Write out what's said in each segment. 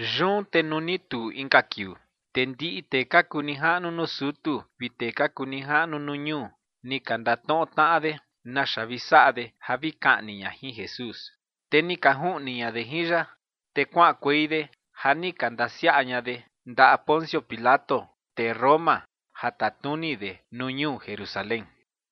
Yun te nuu ni tuu inka kiuu, te ndiꞌi tee ka kuu nijaꞌnu nuu sutu vi tee ka kuu nijaꞌnu nuu ñuu ni ka ndatnoꞌo tnaꞌa de naxa vi saꞌa de ja vi kaꞌni ña jin Jesús. Te ni ka juꞌni ña de jin ya, te kuaꞌankuei de ja ni ka ndasiaꞌa ña de ndaꞌa Poncio Pilato, tee Roma, ja tatnuni de nuu ñuu Jerusalén.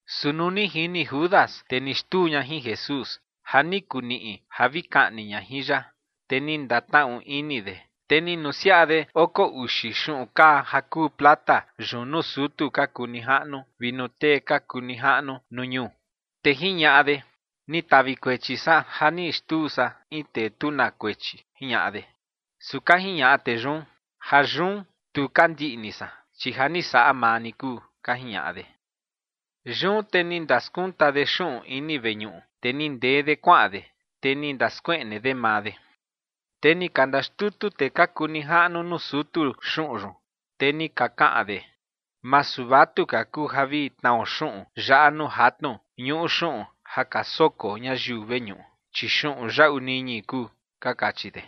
Su nuu ni jini Judas, tee ni xtuu ña jin Jesús, ja ni kuu niꞌi ja vi kaꞌni ña jin ya, te ni ndatnaꞌu ini de, te ni nusiaꞌa de oko uxi xuꞌun kaa ja kuu plata yun nuu sutu ka kuu nijaꞌnu vi nuu tee ka kuu nijaꞌnu nuu ñuu. Te jiñaꞌa de: ͏―͏Ni tavi kuechi san ja ni xtuu san in tee tu na kuechi ͏―͏jiñaꞌa de. Su ka jiñaꞌa tee yun: ͏―͏Jayun tu ka ndiꞌni san, chi ja ni saꞌa maa ni kuu ͏―͏ka jiñaꞌa de. Yun te ni ndaskunta de xuꞌun ini veñuꞌu, te ni ndee de kuaꞌan de, te ni ndaskueꞌne de maa de. Te ni ka ndaxtutu tee ka kuu nijaꞌnu nuu sutu xuꞌun yun, te ni ka kaꞌan de: ͏―͏Masu vatuka kuu ja vi tnao xuꞌun yaꞌa nuu jatnu ñuꞌu xuꞌun ja ka soko ñayiu veñuꞌu, chi xuꞌun yaꞌu niñi kuu ͏―͏ka kachi de.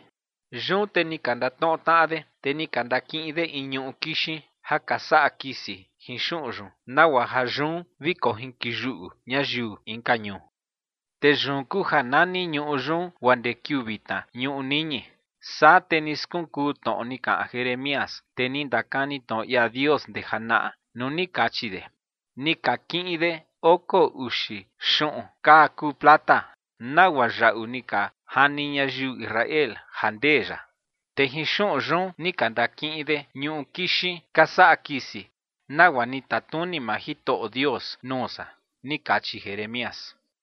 Yun te ni ka ndatnoꞌo tnaꞌa de, te ni ka ndakiꞌin de in ñuꞌu kixin ja ka saꞌa kisi jin xuꞌun yun, nagua ja yun vi kojinkoyuꞌu ñayiu inka ñuu. Te yun kuu ja nani ñuꞌu yun guaa ndee kiuu vitna ñuꞌu niñi. Saa te ni skunkuu tnoꞌo ni kaꞌan Jeremías, tee ni ndakani tnoꞌo ia Dios ndee janaꞌa nuu ni kachi de: “Ni ka kiꞌin de oko uxi xuꞌun kaa kuu plata, nagua yaꞌu ni ka jani ñayiu Israel ja ndee ya. Te jin xuꞌun yun ni ka ndakiꞌin de ñuꞌu kixin ka saꞌa kisi, nagua ni tatnuni maa Jitoꞌo Dios nuu san”, ni kachi Jeremías.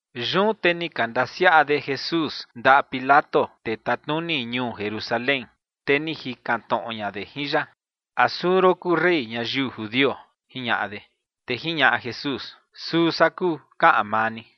Yun te ni ka ndasiaꞌa de Jesús ndaꞌa Pilato, tee tatnuni ñuu Jerusalén, te ni jikan tnoꞌo ña de jin ya: ͏―͏¿A suu ron kuu rey ñayiu judio? ͏―͏jiñaꞌa de. Te jiñaꞌa Jesús: ͏―͏Suu san kuu kaꞌan maa ni.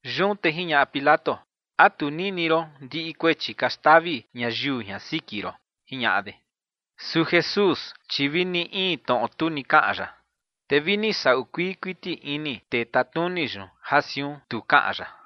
Yun te jiñaꞌa Pilato: ͏―͏¿A tu nini ron ndiꞌi kuechi ka xtavi ñayiu jian siki ron? ͏―͏jiñaꞌa de. Su Jesús, chi vi ni in tnoꞌo tu ni kaꞌan ya. Te vi ni saꞌu kuii kuiti ini tee tatnuni yun ja siun tu kaꞌan ya.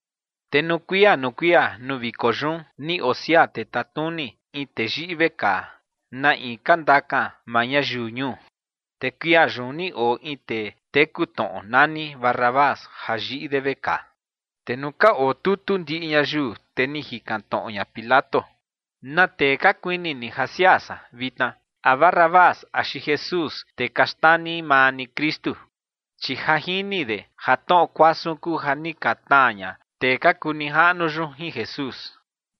Te nuu kuia nuu kuia nuu viko yun, ni osiaa tee tatnuni in tee yiꞌi vekaa, na in ka ndakan maa ñayiu ñuu. Te kuia yun ni oo in tee teku tnoꞌo nani Barrabás, ja yiꞌi de vekaa. Te nuu ka otutu ndiꞌi ñayiu, te ni jikan tnoꞌo ña Pilato: ͏―͏¿Na tee ka kuini ni ja siaa san vitna? ¿A Barrabás axi Jesús, tee ka xnani maa ni Kristu? Chi ja jini de ja tnoꞌo kuasun kuu ja ni ka tnaa ña tee ka kuu nijaꞌnu yun jin Jesús.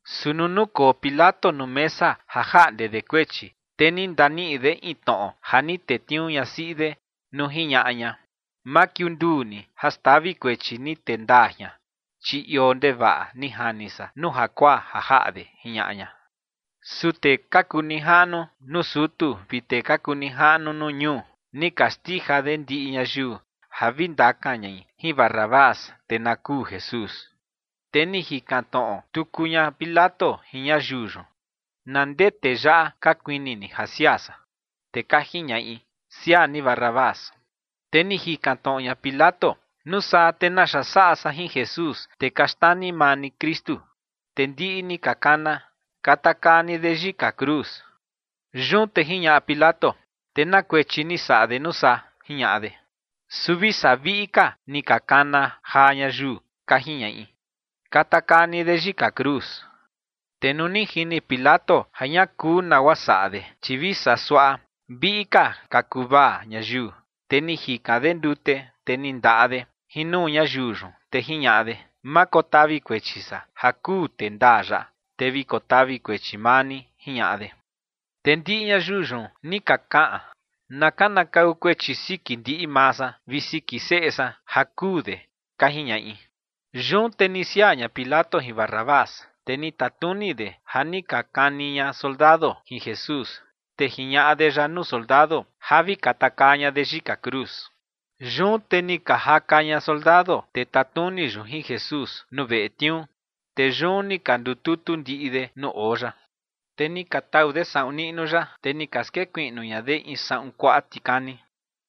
Su nuu nukoo Pilato nuu mesa ja jaꞌnde de kuechi, te ni ndaniꞌi de in tnoꞌo ja ni tetniuu ñasiꞌi de nuu jiñaꞌa ña: ͏―͏Ma kiunduu ni ja xtavi kuechi ni tee ndaa jian, chi ioo ndevaꞌa ni jani san nuu jakuaa ja jaꞌa de ͏―͏jiñaꞌa ña. Su tee ka kuu nijaꞌnu nuu sutu vi tee ka kuu nijaꞌnu nuu ñuu, ni ka xtija de ndiꞌi ñayiu ja vi ndakan ñai jin Barrabás, te na kuu Jesús. Te ni jikan tnoꞌo tuku ña Pilato jin ñayiu yun: ͏―͏¿Na ndee tee yaꞌa ka kuini ni ja siaa san? Te ka jiñaꞌi: ͏―͏Siaa ni Barrabás. Te ni jikan tnoꞌo ña Pilato: ͏―͏¿Nuu saa, te naxa saꞌa san jin Jesús, tee ka xnani maa ni Kristu? Te ndiꞌi ni ka kana: ͏―͏Katakaa ni de yika cruz. Yun te jiñaꞌa Pilato: ͏―͏¿Te na kuechi ni saꞌa de nuu saa? ͏―͏jiñaꞌa de. Su vi saa viꞌi ka ni ka kana jaa ñayiu, ka jiñaꞌi: ͏―͏Katakaa ni de yika cruz. Te nuu ni jini Pilato ja ña kuu nagua saꞌa de, chi vi saa suaꞌa viꞌi ka ka kuvaa ñayiu, te ni jikan de ndute, te ni ndaꞌa de jin nuu ñayiu yun, te jiñaꞌa de: ͏―͏Ma kotavi kuechi san ja kuu tee ndaa yaꞌa. Te vi kotavi kuechi maa ni ͏―͏jiñaꞌa de. Te ndiꞌi ñayiu yun ni ka kaꞌan: ͏―͏Na kanakau kuechi siki ndiꞌi maa san vi siki seꞌe san ja kuu de ͏―͏ka jiñaꞌi. Yun te ni siaa ña Pilato jin Barrabás, te ni tatnuni de ja ni ka kani ña soldado jin Jesús, te jiñaꞌa de ya nuu soldado ja vi katakaa ña de yika cruz. Yun te ni ka jaka ña soldado tee tatnuni yun jin Jesús nuu veꞌe tniuu, te yun ni ka ndututu ndiꞌi de nuu oo ya. Te ni ka tau de saꞌun niꞌnu ya, te ni ka skekuiꞌnu ña de in saꞌun kuaꞌa tikani.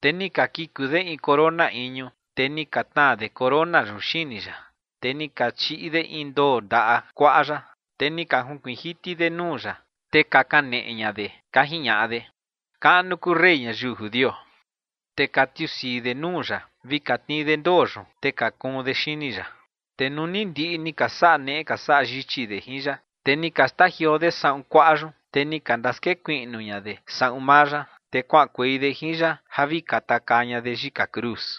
Te ni ka kiku de in corona iñu, te ni ka tnaa de corona yun xini ya. Te ni ka chiꞌi de in ndoo ndaꞌa kuaꞌa ya, te ni ka junkuiin jiti de nuu ya, te ka kaneꞌe ña de, ka jiñaꞌa de: ͏―͏¡Kaꞌnu kuu rey ñayiu judio! Te ka tiusii de nuu ya vi ka tnii de ndoo yun, te ka kuun de xini ya. Te nuu ni ndiꞌi ni ka saꞌa neꞌe ka saꞌa yichi de jin ya, te ni ka xtajioo de saꞌun kuaꞌa yun, te ni ka ndaskekuiꞌnu ña de saꞌun maa ya, te kuaꞌankuei de jin ya ja vi katakaa ña de yika cruz.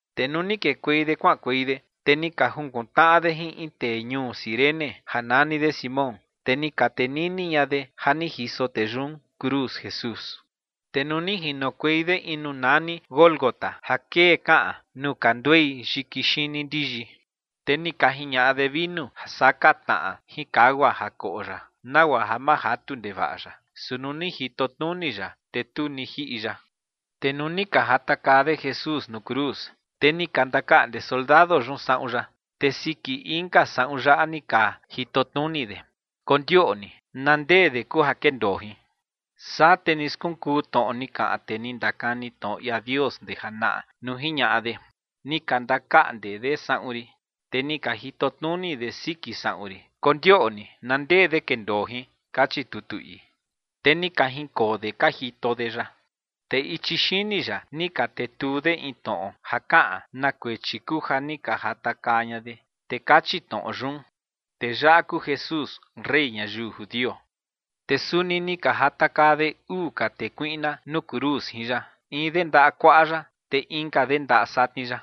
Te nuu ni kekuei de kuaꞌankuei de, te ni ka jukun tnaꞌa de jin in tee ñuu Cirene ja nani de Simón, te ni ka tenini ña de ja ni jiso tee yun cruz Jesús. Te nuu ni jinokuei de in nuu nani Gólgota ja kee kaꞌan nuu ka nduei yiki xini ndiyi, te ni ka jiñaꞌa de vinu ja saka tnaꞌa jin kagua ja koꞌo ya, nagua ja ma jatu ndevaꞌa ya. Su nuu ni jito tnuni ya, te tu ni jiꞌi ya. Te nuu ni ka jatakaa de Jesús nuu cruz, te ni ka ndakaꞌnde soldado yun saꞌun ya, te siki inka saꞌun ya ni ka jitotnuni de, kondioꞌni na ndee de kuu ja kendoo jin. Saa te ni skunkuu tnoꞌo ni kaꞌan tee ni ndakani tnoꞌo ia Dios ndee janaꞌa nuu jiñaꞌa de: “Ni ka ndakaꞌnde de saꞌun rin, te ni ka jitotnuni de siki saꞌun rin, kondioꞌni na ndee de kendoo jin”, kachi tutu ii. Te ni ka jinkoo de ka jito de ya. Te ichi xini ya ni ka tetuu de in tnoꞌo ja kaꞌan na kuechi kuu ja ni ka jatakaa ña de, te kachi tnoꞌo yun: “Tee yaꞌa kuu Jesús, rey ñayiu judio”. Te suni ni ka jatakaa de uu ka tee kuiꞌna nuu cruz jin ya, in de ndaꞌa kuaꞌa ya, te inka de ndaꞌa satni ya.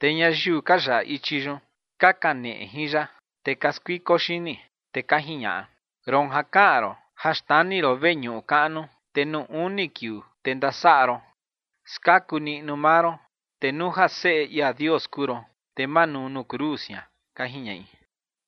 Te ñayiu ka yaꞌa ichi yun, ka kaneꞌe jin ya, te ka skuiko xini. Te ka jiñaꞌa: ͏―͏Roon ja kaꞌan ron ja xnani ron veñuꞌu kaꞌnu, te nuu uni kiuu, te ndasaꞌa ron, skaku niꞌnu maa ron. Te nuu ja Seꞌe ia Dios kuu ron, te manuu nuu cruz jian ͏―͏ka jiñaꞌi.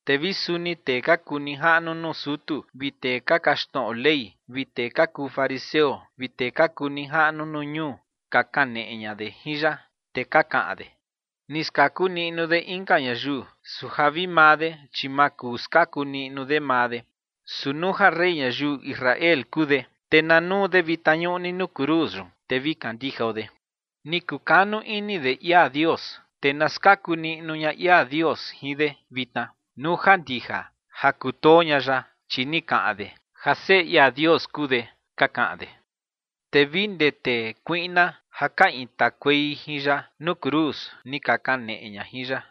Te vi suni tee ka kuu nijaꞌnu nuu sutu vi tee ka kaxtnoꞌo Ley vi tee ka kuu fariseo vi tee ka kuu nijaꞌnu nuu ñuu ka kaneꞌe ña de jin ya, te ka kaꞌan de: ͏―͏Ni skaku niꞌnu de inka ñayiu, su ja vi maa de, chi ma kuu skaku niꞌnu de maa de. Su nuu ja rey ñayiu Israel kuu de, te na nuu de vitna ñuꞌni nuu cruz yun, te vi kandijao de. Ni kukanu ini de ia Dios, te na skaku niꞌnu ña ia Dios jin de vitna, nuu ja ndija ja kutoo ña ya, chi ni kaꞌan de ja Seꞌe ia Dios kuu de ͏―͏ka kaꞌan de. Te vi ndee tee kuiꞌna ja ka intakuei jin ya nuu cruz, ni ka kaneꞌe ña jin ya.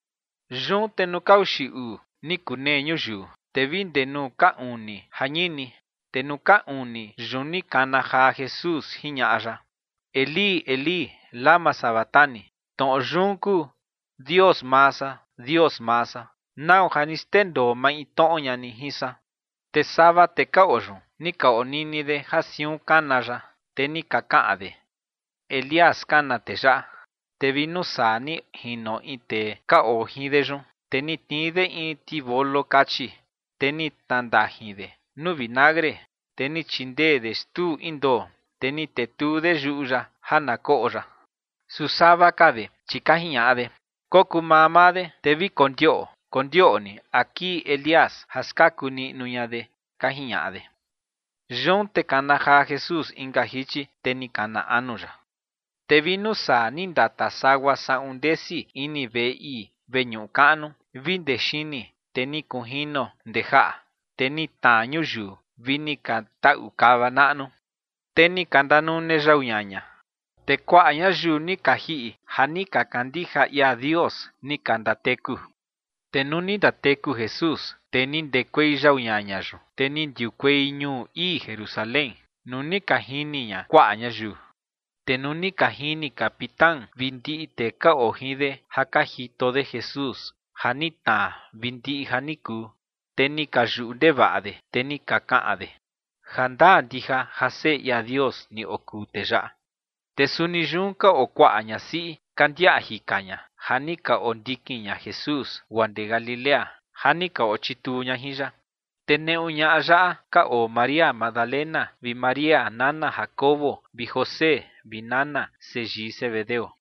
Yun te nuu ka uxi uu ni kunee ñuyiu, te vi ndee nuu ka uni jañini. Te nuu ka uni yun ni kana jaa Jesús, jiñaꞌa ya: ͏―͏Elí, Elí, ¿lama sabactani? Tnoꞌo yun kuu: Dios maa san, Dios maa san, ¿nau ja ni xndendoo maintnoꞌo ña ni jin san? Te sava tee ka oo yun, ni ka onini de ja siun kana ya, te ni ka kaꞌan de: ͏―͏Elías kana tee yaꞌa. Te vi nuu saa ni jino in tee ka oo jin de yun, te ni tnii de in tivolo kachi, te ni tnandajin de nuu vinagre, te ni chindee de xtuu in ndoo, te ni tetuu de yuꞌu ya ja na koꞌo ya. Su sava ka de, chi ka jiñaꞌa de: ͏―͏Kokuu mamaa de, te vi kondiaꞌo kondioꞌni a kii Elías ja skaku niꞌnu ña de ͏―͏ka jiñaꞌa de. Yun te kana jaa Jesús inka jichi, te ni kana anu ya. Te vi nuu saa ni ndata sagua saꞌun ndesi ini veꞌe ii veñuꞌu kaꞌnu vi ndee xini, te ni kunjino ndee jaꞌa, te ni tnaa ñuyiu vi ni ka taꞌu kava naꞌnu. Te ni ka ndanune yau ñaña, te kuaꞌa ñayiu ni ka jiꞌi ja ni ka kandija ia Dios, ni ka ndateku. Te nuu ni ndateku Jesús, te ni ndekuei yau ñaña yun, te ni ndiukuei ñuu ii Jerusalén, nuu ni ka jini ña kuaꞌa ñayiu. Te nuu ni ka jini capitán vi ndiꞌi tee ka oo jin de ja ka jito de Jesús, ja ni tnaa vi ndiꞌi ja ni kuu, te ni ka yuꞌu ndevaꞌa de, te ni ka kaꞌan de: ͏―͏Jandaa ndija ja Seꞌe ia Dios ni okuu tee yaꞌa. Te suni yun ka oo kuaꞌa ñasiꞌi ka ndiaꞌa jika ña, ja ni ka ondikin ña Jesús guaa ndee Galilea, ja ni ka ochituu ña jin ya. Te neꞌu ñaꞌa yun ka oo María Magdalena vi María nana Jacobo vi José vi nana seyii Zebedeo.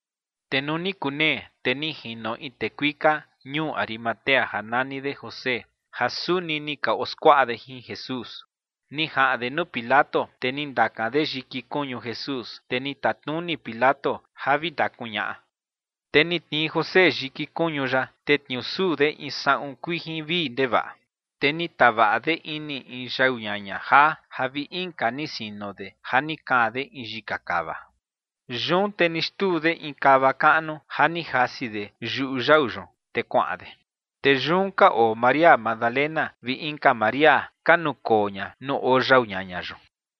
Te nuu ni kunee, te ni jino in tee kuika ñuu Arimatea ja nani de José, ja suni ni ka oskuaꞌa de jin Jesús. Ni jaꞌan de nuu Pilato, te ni ndakan de yiki kuñu Jesús, te ni tatnuni Pilato ja vi ndakuñaꞌa. Te ni tnii José yiki kuñu ya, te tniusuu de in saꞌun kuijin vii ndevaꞌa. Te ni tavaꞌa de ini in yau ñaña jaa ja vi inka ni sino de ja ni kaan de in yika kava. Yun te ni xtuu de in kava kaꞌnu ja ni jasi de yuꞌu yau yun, te kuaꞌan de. Te yun ka oo María Magdalena vi inka María, ka nukoo ña nuu oo yau ñaña yun.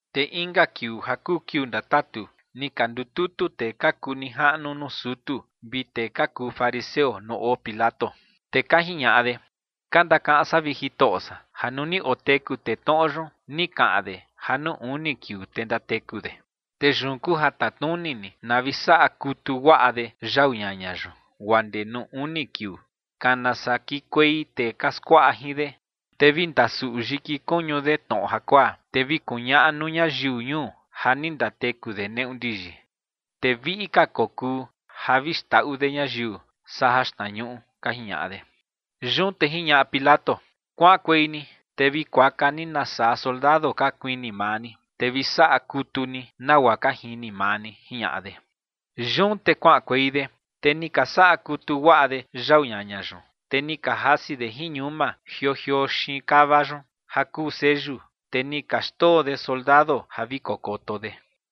Te inka kiuu ja kuu kiuu ndatatu, ni ka ndututu tee ka kuu nijaꞌnu nuu sutu vi tee ka kuu fariseo nuu oo Pilato. Te ka jiñaꞌa de: ͏―͏Ka ndakaꞌan san, vi jitoꞌo san, ja nuu ni oteku tee tnoꞌo yun, ni kaꞌan de ja nuu uni kiuu, te ndateku de. Te yun kuu ja tatnuni ni na vi saꞌa kutu guaꞌa de yau ñaña yun, guaa ndee nuu uni kiuu, kana saa kiꞌinkuei tee ka skuaꞌa jin de, te vi ndasuꞌu yiki kuñu de tnoꞌo jakuaa, te vi kuñaꞌa nuu ñayiu ñuu ja ni ndateku de neꞌu ndiyi. Te viꞌi ka kokuu ja vi xndaꞌu de ñayiu saa jaxtnañuꞌu ͏―͏ka jiñaꞌa de. Yun te jiñaꞌa Pilato: ͏―͏Kuaꞌankuei ni, te vi kuaka ni nasaa soldado ka kuini maa ni, te vi saꞌa kutu ni nagua ka jini maa ni ͏―͏jiñaꞌa de. Yun te kuaꞌankuei de, te ni ka saꞌa kutu guaꞌa de yau ñaña yun, te ni ka jasi de jin ñuma jioo jioo xiin kava yun ja kuu seyu, te ni ka xndoo de soldado ja vi kokoto de.